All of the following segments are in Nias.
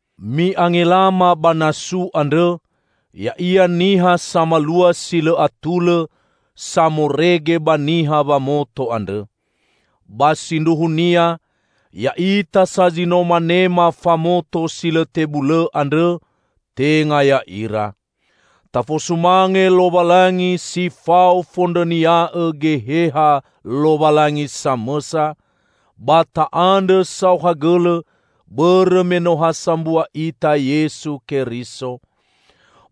Mi'angelama ba 'nasu' andrõ, ya'ia niha samalua si lõ atulõ, samorege ba niha wamoto andrõ. Ba sindruhunia ya'ita sa zi no manema famoto si lõ tebulõ andrõ, tenga ya'ira. Tafosumange Lowalangi si fao fondrõnia'õ Geheha Lowalangi samõsa, ba ta'andrõ saohagõlõ bõrõ me no ha sambua ita Yesu Keriso.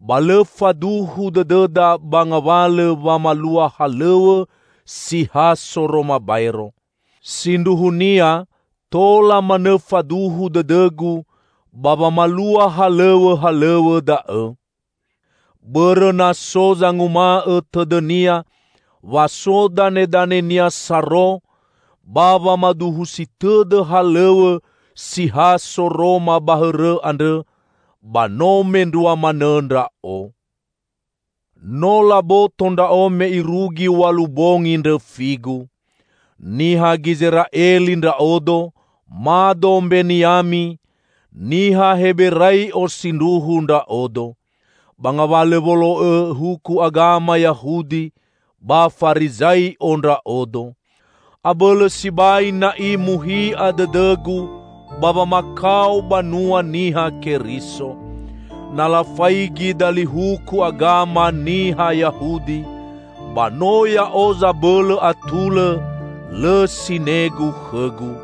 Ba lõ faduhu dõdõda ba ngawalõ wamalua halõw̃õ si ha soroma baero. Sindruhunia tola manõ faduhu dõdõgu ba wamalua halõw̃õhalõw̃õ da'õ. Bõrõ na so zanguma'õ tõdõnia wa so danedanenia saro ba wamaduhusi tõdõ halõw̃õ si ha soroma ba hõrõ andrõ, ba no mendrua manõ ndra'o. No laboto ndra'o me irugi w̃alu bongi ndrõfigu. Niha Gizera'eli ndra'odo, mado Mbeniami; niha Heberai'o sindruhu ndra'odo. Ba ngawalõ wolo'õ huku agama Yahudi, ba Farizai'o ndra'odo. Abõlõ sibai na'i muhi'a dõdõgu ba wamakao banua Niha Keriso. Na lafaigi dali huku agama niha Yahudi, ba no ya'o zabõlõ atulõ, lõ sinegu khõgu.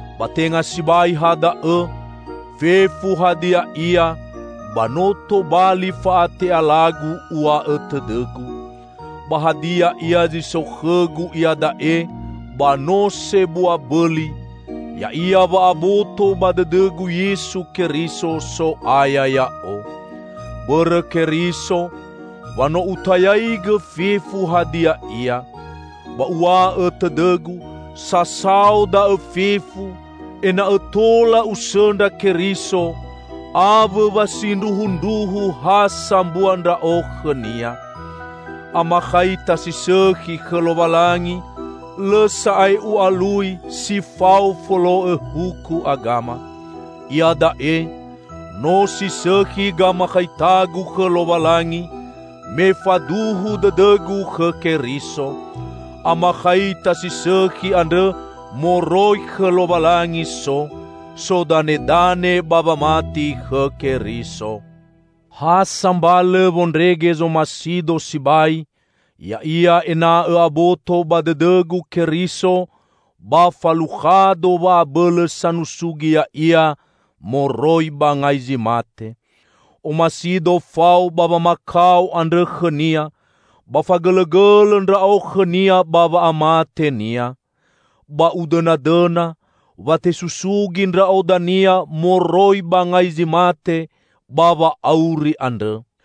Ba tenga sibai ha da'õ; fefu hadia ia, ba no tobali fa'ate'alagu, uw̃a'õ tõdõgu. Ba hadia ia zi so khõgu iada'e ba no sebua bõli: ya'ia wa'aboto ba dõdõgu Yesu Keriso, So'aya ya'o. Bõrõ Keriso, wa no utayaigõ fefu hadia ia. Ba uw̃a'õ tõdõgu sasao da'õ fefu, ena'õ tola usõndra Keriso, awõ wa sindruhundruhu ha sambua ndra'o khõ-Nia. Amakhaita si sõkhi khõ Lowalangi lõ sa'ae u'alui si fao folo'õ huku agama. Iada'e, no si sõkhi gamakhaitagu khõ Lowalangi, me faduhu dõdõgu khõ Keriso. Amakhaita si sõkhi andrõ moroi khõ Lowalangi so, sodanedane ba wamati khõ Keriso. Ha sambalõ wondrege zomasido sibai ya'ia ena'õ aboto ba dõdõgu Keriso, ba falukhado wa'abõlõ sanusugi Ya'ia moroi ba ngai zi mate. Omasido fao ba wamakao andrõ khõ-Nia, ba fagõlõgõlõ ndra'o khõ-Nia ba wa'amate-Nia. Ba udõnadõna wa tesusugi ndra'o dania moroi ba ngai zi mate, ba wa'auri andrõ.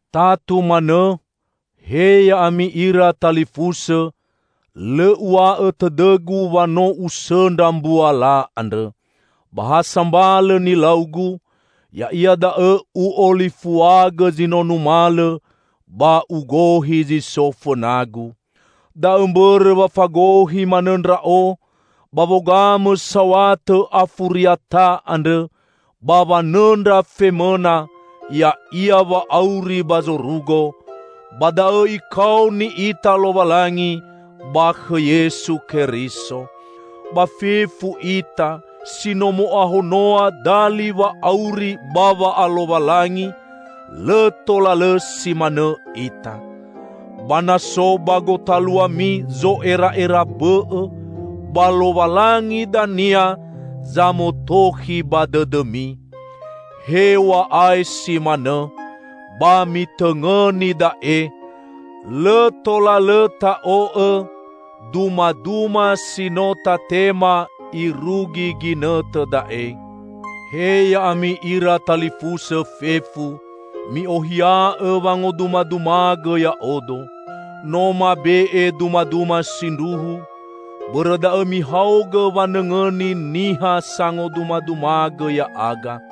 Tatu manõ, he ya'ami ira talifusõ, lõ uw̃a'õ tõdõgu wa no usõndra mbuala andrõ. Ba ha sambalõ nilaugu, ya'ia da'õ u'olifuagõ zi no numalõ ba ugohi zi so fõnagu. Da'õ mbõrõ wa fagohi manõ ndra'o ba wogamõ saw̃atõ afuriata andrõ, ba wanõndra femõna, ya'ia wa'auri ba zorugo; ba da'õ Ikaoni ita Lowalangi ba khõ Yesu Keriso. Ba fefu ita si no mo'ahonoa dali wa'auri ba wa'alowalangi, lõ tola lõ si manõ ita. Ba na so ba gotaluami zo'era'era bõ'õ, ba Lowalangi dania zamotokhi ba dõdõmi. Hew̃a'ae si manõ, ba mitõngõni da'e: Lõ tola lõ ta'o'õ dumaduma si no tatema irugi ginõtõ da'e. He ya'ami ira talifusõ fefu! Mi'ohia'õ wangodumadumagõ ya'odo. No mabe'e dumaduma sindruhu, bõrõ da'õ mihaogõ wanõngõni niha sangodumadumagõ ya'aga.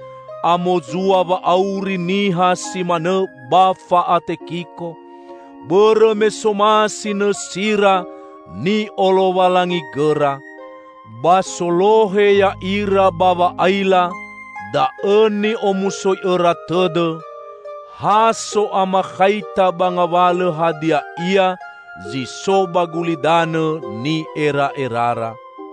Amozua wa'auri niha si manõ ba fa'atekiko, bõrõ me somasi nõsira ni'olowalangigõra. Ba solohe ya'ira ba wa'aila da'õ ni'omusoi'õra tõdõ; ha so'amakhaita ba ngawalõ hadia ia zi so ba gulidanõ ni'era'erara.